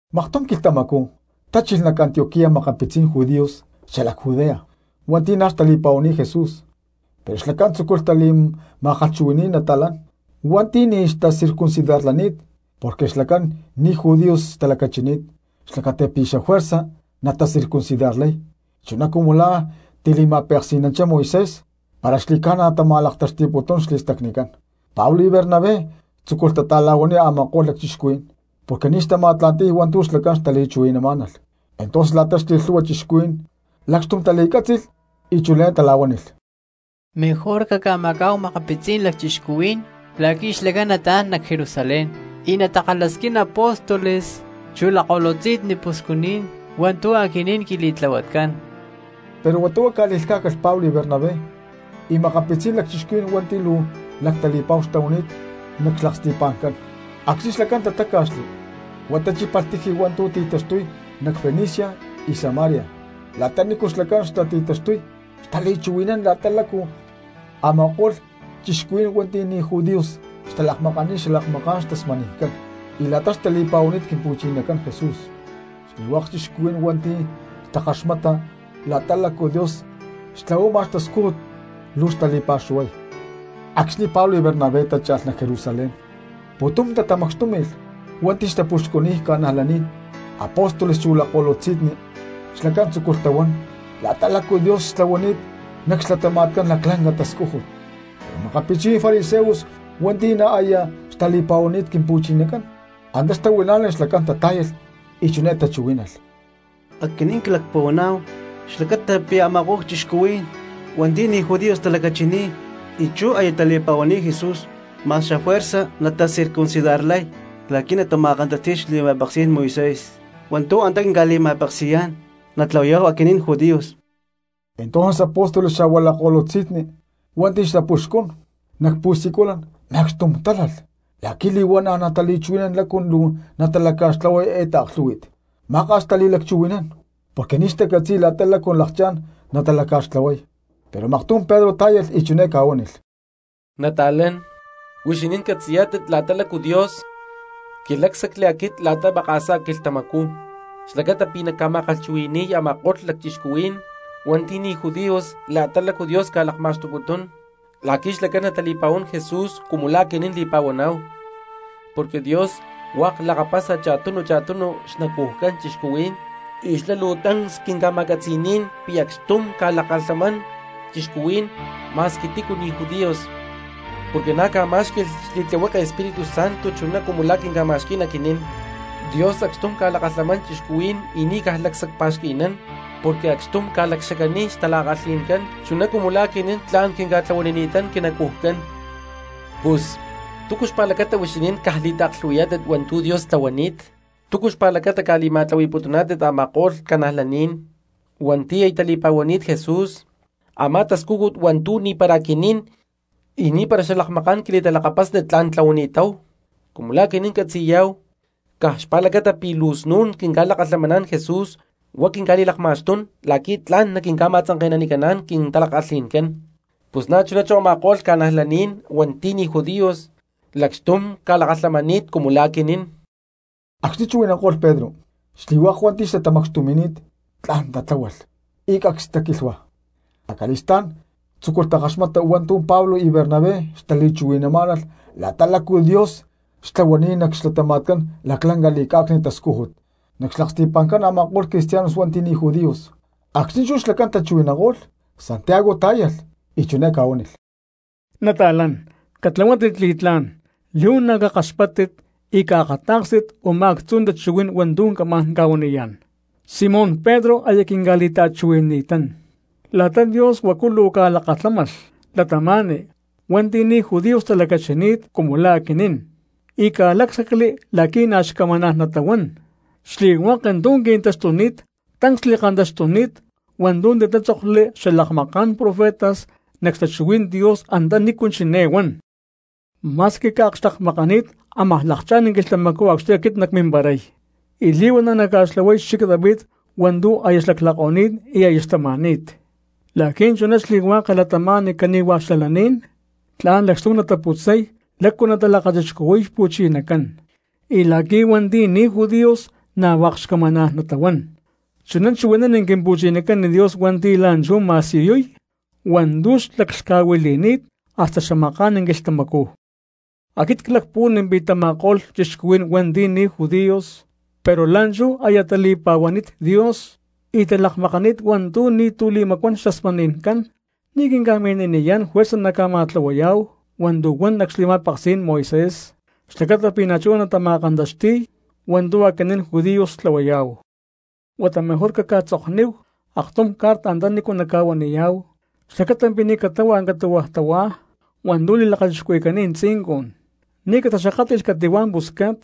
Maktum quilhtamacú tachilh nac Antioquía makapitzí̠n judíos xalac Judea hua̠nti̠ na̠ xtali̠pa̠huani̠t Jesús pero xlacán tzúculh tali̠ma̠kalhchuhui̠ni̠y nata̠lán hua̠nti̠ ni̠ xtacircuncidarlani̠t porque xlacán ni̠ judíos xtalacachini̠t, xlacata pi̠ xajuerza natacircuncidarlay chuná cumu la̠ tili̠ma̠peksi̠nanchá Moisés, para xli̠ca̠na talakma̠xtuputún xli̠stacnicán. Pablo y Bernabé tzúculh tata̠la̠huaniy a̠ma̠ko̠lh lacchixcuhuí̠n porque ni̠ xtama̠tla̠nti̠y hua̠ntu̠ xlacán xtali̠chuhui̠namá̠nalh. Entonces la̠ta xli̠lhu̠hua cristianos lacxtum tali̠cátzi̠lh y chiné tala̠huánilh: —Mejor caca̠macá̠hu makapitzí̠n lacchixcuhuí̠n la̠qui̠ xlacán nataán nac Jerusalén y natakalhasquín apóstoles chu lakko̠lutzi̠nni puxcu̠naní̠n hua̠ntu̠ aquinín quili̠tlahuatcán. Pero huata huá ca̠li̠lhcá̠calh Pablo, Bernabé y makapitzí̠n lacchixcuhuí̠n hua̠nti̠ luu lactali̠pa̠hu xtahuani̠t nac xlaksti̠pa̠ncán. Acxni̠ xlacán tatáca̠xli huá tachípalh tiji hua̠ntu̠ xti̠taxtuy nac Fenicia y Samaria. La̠ta nícu xlacán xtati̠taxtuy xtali̠chuhui̠nán la̠ta lácu a̠ma̠ko̠lh cristianos hua̠nti̠ ni̠ judíos xtalakmakani̠t xalakmaká̠n xtasmani̠ncán y la̠ta xtali̠pa̠huani̠t Quimpu̠chinacán Jesús. Xli̠hua̠k cristianos hua̠nti̠ xtakaxmata la̠ta lácu Dios xtlahuama xtascújut luu xtali̠pa̠xuhuay. Acxni̠ Pablo y Bernabé tácha̠lh nac Jerusalén pu̠tum tatamacxtúmi̠lh hua̠nti̠ xtapuxcuniy cristianos, apóstoles chu lakko̠lutzi̠nni. Xlacán tzúculh tahuán la̠ta lácu Dios xtlahuani̠t nac xlatama̠tcán laclanca tascújut. Pero makapitzí̠n fariseos hua̠nti̠ na̠ aya xtali̠pa̠huani̠t Quimpu̠chinacán antá xtahuilá̠nalh xlacán tatá̠yalh y chiné tachuhuí̠nalh: —Aquinín clacpuhuaná̠hu xlacata pi̠ a̠ma̠ko̠lh cristianos hua̠nti̠ ni̠ judíos talacachini̠t y chú aya tali̠pa̠huani̠t Jesús, ma̠x xafuerza natacircuncidarlay la̠qui̠ natama̠kantaxti̠y xli̠ma̠peksí̠n Moisés hua̠ntu̠ antá quinca̠li̠ma̠peksi̠yá̠n natlahuayá̠hu aquinín judíos. Entonces apóstoles xa̠hua lakko̠lutzi̠nni hua̠nti̠ xtapuxcún nac pu̠siculan macxtum tálalh la̠qui̠ li̠huana̠ natali̠chuhui̠nán lácu luu nataca̠xtlahuay eé taaklhú̠hui̠t. Maka̠s xtali̠lacchuhui̠nán porque ni̠ xtacatzi̠y la̠ta lácu lakchá̠n natatlahuay, pero maktum Pedro tá̠yalh y chiné ca̠huánilh: —Nata̠lán, huixinín catzi̠yá̠tit la̠ta lácu Dios quilácsacli aquit la̠ta maka̠sá quilhtamacú xlacata pi̠ nacca̠ma̠kalhchuhui̠ni̠y a̠ma̠ko̠lh cristianos hua̠nti̠ ni̠ judíos la̠ta lácu Dios ca̠lakma̠xtuputún la̠qui̠ xlacán natali̠pa̠huán Jesús cumu la̠ aquinín li̠pa̠huaná̠hu. Porque Dios hua̠k lakapasa cha̠tunu cha̠tunu xnacujcán cristianos y xlá luu tancs quinca̠ma̠catzi̠ní̠n pi̠ acxtum ca̠lakalhamán cristianos ma̠squi tícu ni̠ judíos, porque na̠ ca̠má̠xqui̠lh xli̠tlihueke Espíritu Santo chuná cumu la̠ quinca̠ma̠xquí̠n aquinín. Dios acxtum ca̠lakalhamán cristianos y ni̠ caj lacsacpa̠xqui̠nán porque acxtum ca̠lacxacaniy xtala̠kalhi̠ncán chuná cumu la̠ aquinín tla̠n quinca̠tlahuanini̠tán quinacujcán. Pus, ¿túcu xpa̠lacata huixinín caj li̠taaklhu̠hui̠yá̠tit hua̠ntu̠ Dios tlahuani̠t? ¿Túcu xpa̠lacata ca̠li̠ma̠tlahui̠putuná̠tit a̠ma̠ko̠lh cristianos hua̠nti̠ aya tali̠pa̠huani̠t Jesús a̠má tascújut hua̠ntu̠ ni̠para aquinín y ni̠para xalakmaká̠n quili̠talakapasni tla̠n tlahuani̠táhu? Cumu la̠ aquinín catzi̠yá̠hu, caj xpa̠lacata pi̠ luu snu̠n quinca̠lakalhamaná̠n Jesús huá quinca̠li̠lakma̠xtún la̠qui̠ tla̠n naquinca̠ma̠tzanke̠nanicán quintala̠kalhi̠ncán, pus na̠chuná chú a̠ma̠ko̠lh cristianos hua̠nti̠ ni̠ judíos lacxtum ca̠lakalhamani̠t cumu la̠ aquinín. Acxni̠ chuhui̠nanko̠lh Pedro, xli̠hua̠k hua̠nti̠ xtatamacxtumi̠ni̠t tla̠n tatláhualh y cacs taquilhua; acali̠stá̠n tzúculh takaxmata hua̠ntu̠ Pablo y Bernabé xtali̠chuhui̠namá̠nalh la̠ta lácu Dios xtlahuani̠t nac xlatama̠tcán laclanca li̠cá̠cni̠t tascújut nac xlaksti̠pa̠ncán a̠ma̠ko̠lh cristianos hua̠nti̠ ni̠ judíos. Acxni̠ chú xlacán tachuhui̠nanko̠lh, Santiago tá̠yalh y chiné ca̠huánilh: —Nata̠lán, catlahuátit li̠tlá̠n, li̠huana̠ cakaxpáttit y caakatá̠kstit u̠má actzu tachuhuí̠n hua̠ntu̠ camá̠n ca̠huaniyá̠n: Simón Pedro aya quinca̠li̠ta̠chuhui̠nani̠tán la̠ta Dios huacu luu ca̠lakalhámalh cristianos hua̠nti̠ ni̠ judíos talacachini̠t cumu la̠ aquinín y ca̠lácsacli la̠qui̠ na̠ xcamaná̠n natahuán. Xli̠hua̠k tu̠ qui̠taxtuni̠t tancs li̠kantaxtuni̠t hua̠ntu̠ titátzokli xalakmaká̠n profetas nac xtachuhuí̠n Dios anta nícu chiné huán: Ma̠squi cca̠akxtekmakani̠t ámaj lakchá̠n quilhtamacú acxni̠ aquit nacmimparay, y li̠huana̠ nacca̠xtlahuay xchic David hua̠ntu̠ aya xlaclako̠ni̠t y aya xtama̠ni̠t, la̠qui̠ chuná xli̠hua̠k cristianos cani̠hua xalaní̠n tla̠n lacxtum nataputzay lácu natalakachixcuhui̠y Xpu̠chinacán, y la̠qui̠ hua̠nti̠ ni̠ judíos na̠ hua̠k xcamaná̠n natahuán. Chuná chuhui̠nán Quimpu̠chinacán Dios hua̠nti̠ la̠nchú ma̠siyuy hua̠ntu̠ xlaclhca̠huili̠ni̠t hasta xamaká̠n quilhtamacú. ’Aquit clacpuhuán pi̠ tama̠ko̠lh cristianos hua̠nti̠ ni̠ judíos pero la̠nchú aya tali̠pa̠huani̠t Dios y talakmakaní̠t hua̠ntu̠ ni̠tu̠ li̠macuán xtasmani̠ncán, ni̠ quinca̠mini̠niyá̠n juerza naca̠ma̠tlahui̠yá̠hu hua̠ntu̠ huan nac xli̠ma̠peksí̠n Moisés xlacata pi̠ na̠chuná natama̠kantaxti̠y hua̠ntu̠ aquinín judíos tlahuayá̠hu. Huata mejor caj caca̠tzokníhu aktum carta antanícu naca̠huaniyá̠hu xlacata pi̠ ni̠ catáhualh catu̠hua̠ tahuá hua̠ntu̠ li̠lakachixcuhui̠cani̠t tzincun, ni̠ cataxakátli̠lh cati̠hua̠ pusca̠t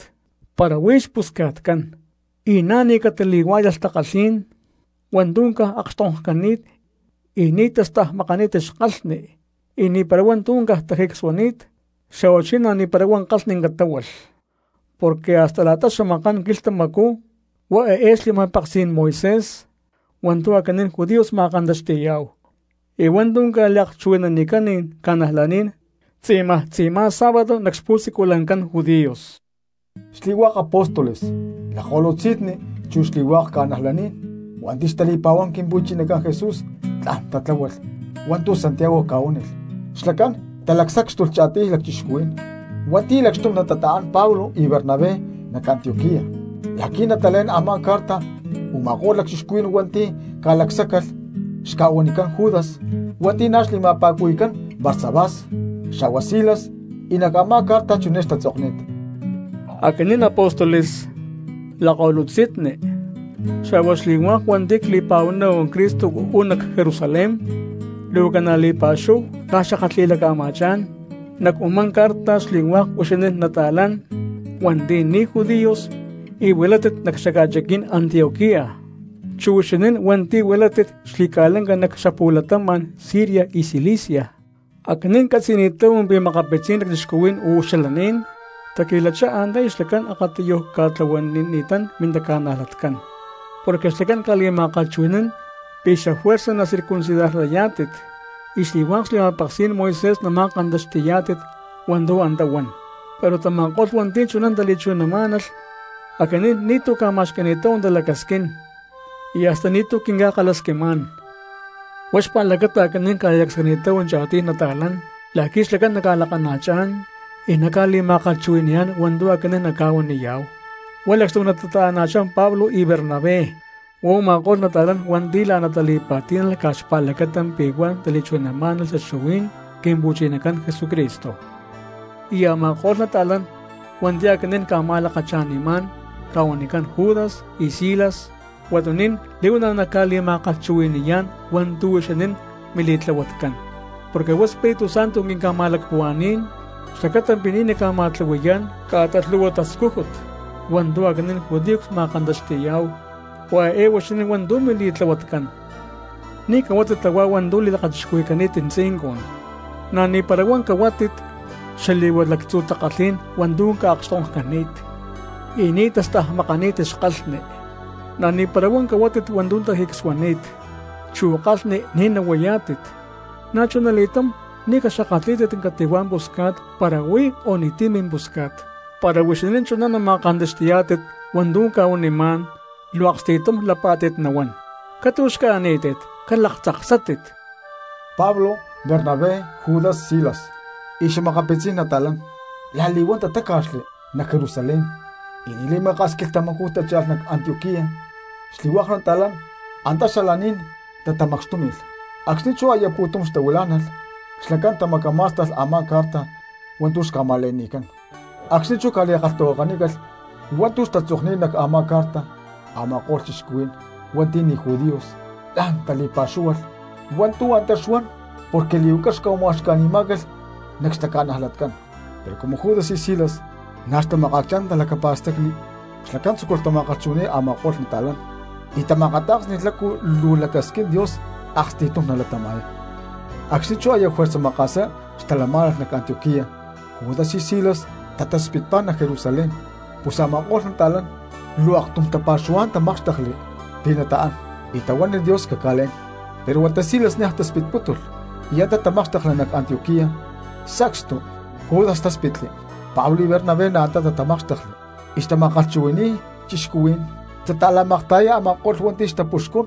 para huí xpusca̠tcán, y na̠ ni̠ catali̠huá̠yalh takalhí̠n hua̠ntu̠ caj ca̠akxtonkcani̠t y ni̠ tastajmakani̠t xkalhni, y ni̠para hua̠ntu̠ caj tajicsuani̠t, xa̠huachí na̠ ni̠para huá kalhni catáhualh. Porque hasta la̠ta xamaká̠n quilhtamacú hua eé xli̠ma̠peksí̠n Moisés hua̠ntu̠ aquinín judíos ma̠kantaxti̠yá̠hu, y hua̠ntu̠ ca̠liakchuhui̠nanicán cristianos tzi̠maj tzi̠má sábado nac xpu̠siculancán judíos. Xli̠hua̠k apóstoles, lakko̠lutzi̠nni, chu xli̠hua̠k cristianos hua̠nti̠ xtali̠pa̠huán Quimpu̠chinacán Jesús tla̠n tatláhualh hua̠ntu̠ Santiago ca̠huánilh, xlacán talacsácxtulh cha̠tiy lacchixcuhuí̠n hua̠nti̠ lacxtum natata̠án Pablo y Bernabé nac Antioquía la̠qui̠ natalé̠n a̠má carta. Uma̠kó̠lh lacchixcuhuí̠n hua̠nti̠ ca̠lacsáccalh xca̠huanicán Judas hua̠nti̠ na̠ xli̠ma̠pa̠cuhui̠cán Barsabás, xa̠hua Silas. Y nac a̠má carta chiné xtatzokni̠t: “Aquinín apóstoles, lakko̠lutzi̠nni, xa̠hua xli̠hua̠k hua̠nti̠ cli̠pa̠huaná̠hu Cristo uú nac Jerusalén, luu ca̠na̠ li̠pa̠xúhu cca̠xakatli̠laca̠ma̠chá̠n nac u̠má carta xli̠hua̠k huixinín nata̠lán hua̠nti̠ ni̠ judíos y huilátit nac xaca̠chiquí̠n Antioquía, chu huixinín hua̠nti̠ huilátit xli̠ca̠lanca nac xapu̠latama̠n Siria y Cilicia. Aquinín ccatzi̠ni̠táhu pi̠ makapitzí̠n lacchixcuhuí̠n uú xalaní̠n taqui̠lachá antá y xlacán akatiyuj ca̠tlahuanini̠tán mintaca̠najlatcán, porque ca̠li̠ma̠kalhchuhui̠ni̠má̠n pi̠ xafuerza nacircuncidarlayá̠tit y xli̠hua̠k xli̠ma̠peksí̠n Moisés nama̠kantaxti̠yá̠tit hua̠ntu̠ antá huan; pero tama̠ko̠lh hua̠nti̠ chuná tali̠chuhui̠namá̠nalh, aquinín ni̠tu̠ cca̠ma̠xqui̠ni̠táhu talacasquín y hasta ni̠tu̠ quinca̠kalhasquimá̠n. Huá xpa̠lacata aquinín cca̠li̠lacsacni̠táhu cha̠tiy lacchixcuhuí̠n la̠qui̠ xlacán naca̠lakana̠chá̠n y naca̠li̠ma̠kalhchuhui̠ni̠yá̠n hua̠ntu̠ aquinín nacca̠huaniyá̠hu, huá lacxtum natata̠ana̠chá Pablo y Bernabé. Huá u̠ma̠ko̠lh nata̠lán hua̠nti̠ la̠ná tali̠pa̠tí̠nalh caj xpa̠lacata pi̠ huá tali̠chuhui̠namá̠nalh xtachuhuí̠n Quimpu̠chinacán Jesucristo. Y a̠ma̠ko̠lh nata̠lán hua̠nti̠ aquinín cca̠ma̠lakacha̠nimá̠n ca̠huanicán Judas y Silas, huatuní̠n li̠huana̠ naca̠li̠ma̠kalhchuhui̠ni̠yá̠n hua̠ntu̠ huixinín mili̠tlahuatcán. Porque huá Espíritu Santo quinca̠ma̠lacpuhua̠ní̠n xlacata pi̠ ni̠ nacca̠ma̠tlahui̠yá̠n ca̠ta lhu̠hua tascújut hua̠ntu̠ aquinín judíos cma̠kantaxti̠yá̠hu. Huá eé hua̠ntu̠ huixinín mili̠tlahuatcán: ni̠ cahuátit tahuá hua̠ntu̠ li̠lakachixcuhui̠cani̠t tzincun, na̠ ni̠para huá cahuátit xali̠hua lactzu̠ takalhí̠n hua̠ntu̠ ca̠akxtonkcani̠t y ni̠ tastajmakani̠t xkalhni, na̠ ni̠para huá cahuátit hua̠ntu̠ tajicsuani̠t, chu kalhni ni̠ nahuayá̠tit. Na̠chunali̠túm ni̠ caxakatlí̠tit cati̠hua̠ pusca̠t para huí o ni̠ti̠ mimpusca̠t. Para huixinín chuná nama̠kantaxti̠yá̠tit hua̠ntu̠ cca̠huanimá̠n luu aksti̠tum lapá̠tit nahuán. Catu̠xca̠ní̠tit calaktzaksátit.” Pablo, Bernabé, Judas, Silas y xa̠makapitzí̠n nata̠lán la̠li̠huán tatáca̠xli nac Jerusalén y ni̠ li̠maka̠s quilhtamacú tácha̠lh nac Antioquía. Xli̠hua̠k nata̠lán antá xalaní̠n tatamacxtúmi̠lh; acxni̠ chú aya pu̠tum xtahuilá̠nalh xlacán tamacamá̠sta̠lh a̠má carta hua̠ntu̠ xca̠ma̠le̠ni̠cán. Acxni̠ chú ca̠li̠kalhtahuakanícalh hua̠ntu̠ xtatzokni̠t nac a̠má carta a̠ma̠ko̠lh cristianos hua̠nti̠ ni̠ judíos la̠n tali̠pa̠xúhualh hua̠ntu̠ antá xuan porque li̠huaca xca̠ma̠uxca̠ni̠má̠calh nac xtaca̠najlatcán. Pero cumu Judas y Silas na̠ xtamakaacchá̠n talacapa̠stacni xlacán tzúculh tama̠kalhchuhui̠ni̠y a̠ma̠ko̠lh nata̠lán y tama̠akatá̠ksni̠lh lácu luu lacasquín Dios aksti̠tum natalatama̠y. Acxni̠ chú aya juerza maka̠sá xtalamá̠nalh nac Antioquía Judas y Silas tataspitpá nac Jerusalén, pus a̠ma̠ko̠lh nata̠lán luu aktum tapa̠xuhuá̠n tamákxtekli pi̠ nataán y tahuánilh Dios caca̠lé̠n. Pero huata Silas niaj taspitpútulh y antá tamákxtekli nac Antioquía y sacstu Judas táspitli. Pablo y Bernabé na̠ antá tatamákxtekli y xtama̠kalhchuhui̠ni̠y cristianos xtata̠la̠makta̠yay a̠ma̠ko̠lh hua̠nti̠ xtapuxcún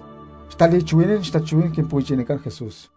xtali̠chuhui̠nán xtachuhuí̠n Quimpu̠chinacán Jesús.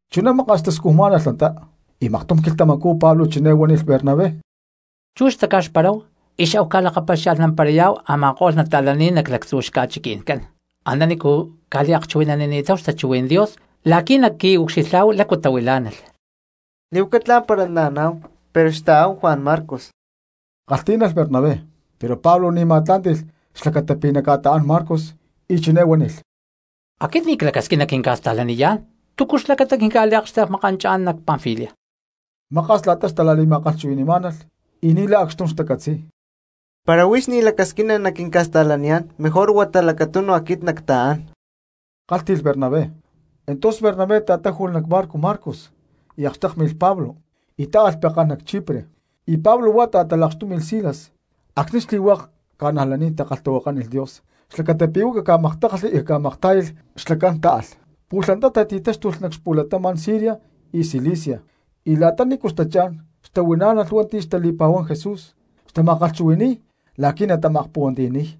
Chuná maka̠s xtascujmá̠nalh antá, y maktum quilhtamacú Pablo chiné huánilh Bernabé: —Chú xtaca̠xparáhu y xahu ca̠lakapaxia̠lhnamparayá̠hu a̠ma̠ko̠lh cristianos nac lactzu̠ xca̠chiqui̠ncán antanícu ca̠liakchuhui̠nanini̠táhu xtachuhuí̠n Dios la̠qui̠ naqui̠ucxilhá̠hu lácu tahuilá̠nalh. —Li̠huaca tla̠n para naaná̠hu, pero xta̠áhu Juan Marcos —kalhtí̠nalh Bernabé. Pero Pablo ni̠ ma̠tlá̠nti̠lh xlacata pi̠ naca̠ta̠án Marcos y chiné huánilh: —Aquit ni̠ clacasquín naquinca̠sta̠laniyá̠n. ¿Túcu xlacata quinca̠liakxtekmi̠chá̠n nac Panfilia? Maka̠s la̠ta xtala̠li̠ma̠aklhuhui̠má̠nalh y ni̠lay acxtum xtacatzi̠y. —Para huix ni̠ lacasquina naquinca̠sta̠laniyá̠n mejor huata lacatunu aquit nacta̠án —kálhti̠lh Bernabé. Entonces Bernabé ta̠táju̠lh nac barco Marcos y akxtékmi̠lh Pablo y táalh pekán nac Chipre, y Pablo huá ta̠talakxtúmi̠lh Silas. Acxni̠ xli̠hua̠k cristianos takalhtahuakánilh Dios xlacata pi̠ huá caca̠maktákalhli y caca̠maktá̠yalh xlacán táalh. Pu̠lh antá tati̠táxtulh nac xapu̠latama̠n Siria y Cilicia, y la̠ta nícu xtachá̠n xtahuilá̠nalh hua̠ntu̠ xtali̠pa̠huán Jesús xtama̠kalhchuhui̠ni̠y la̠qui̠ natama̠akpuhuantiyani̠y.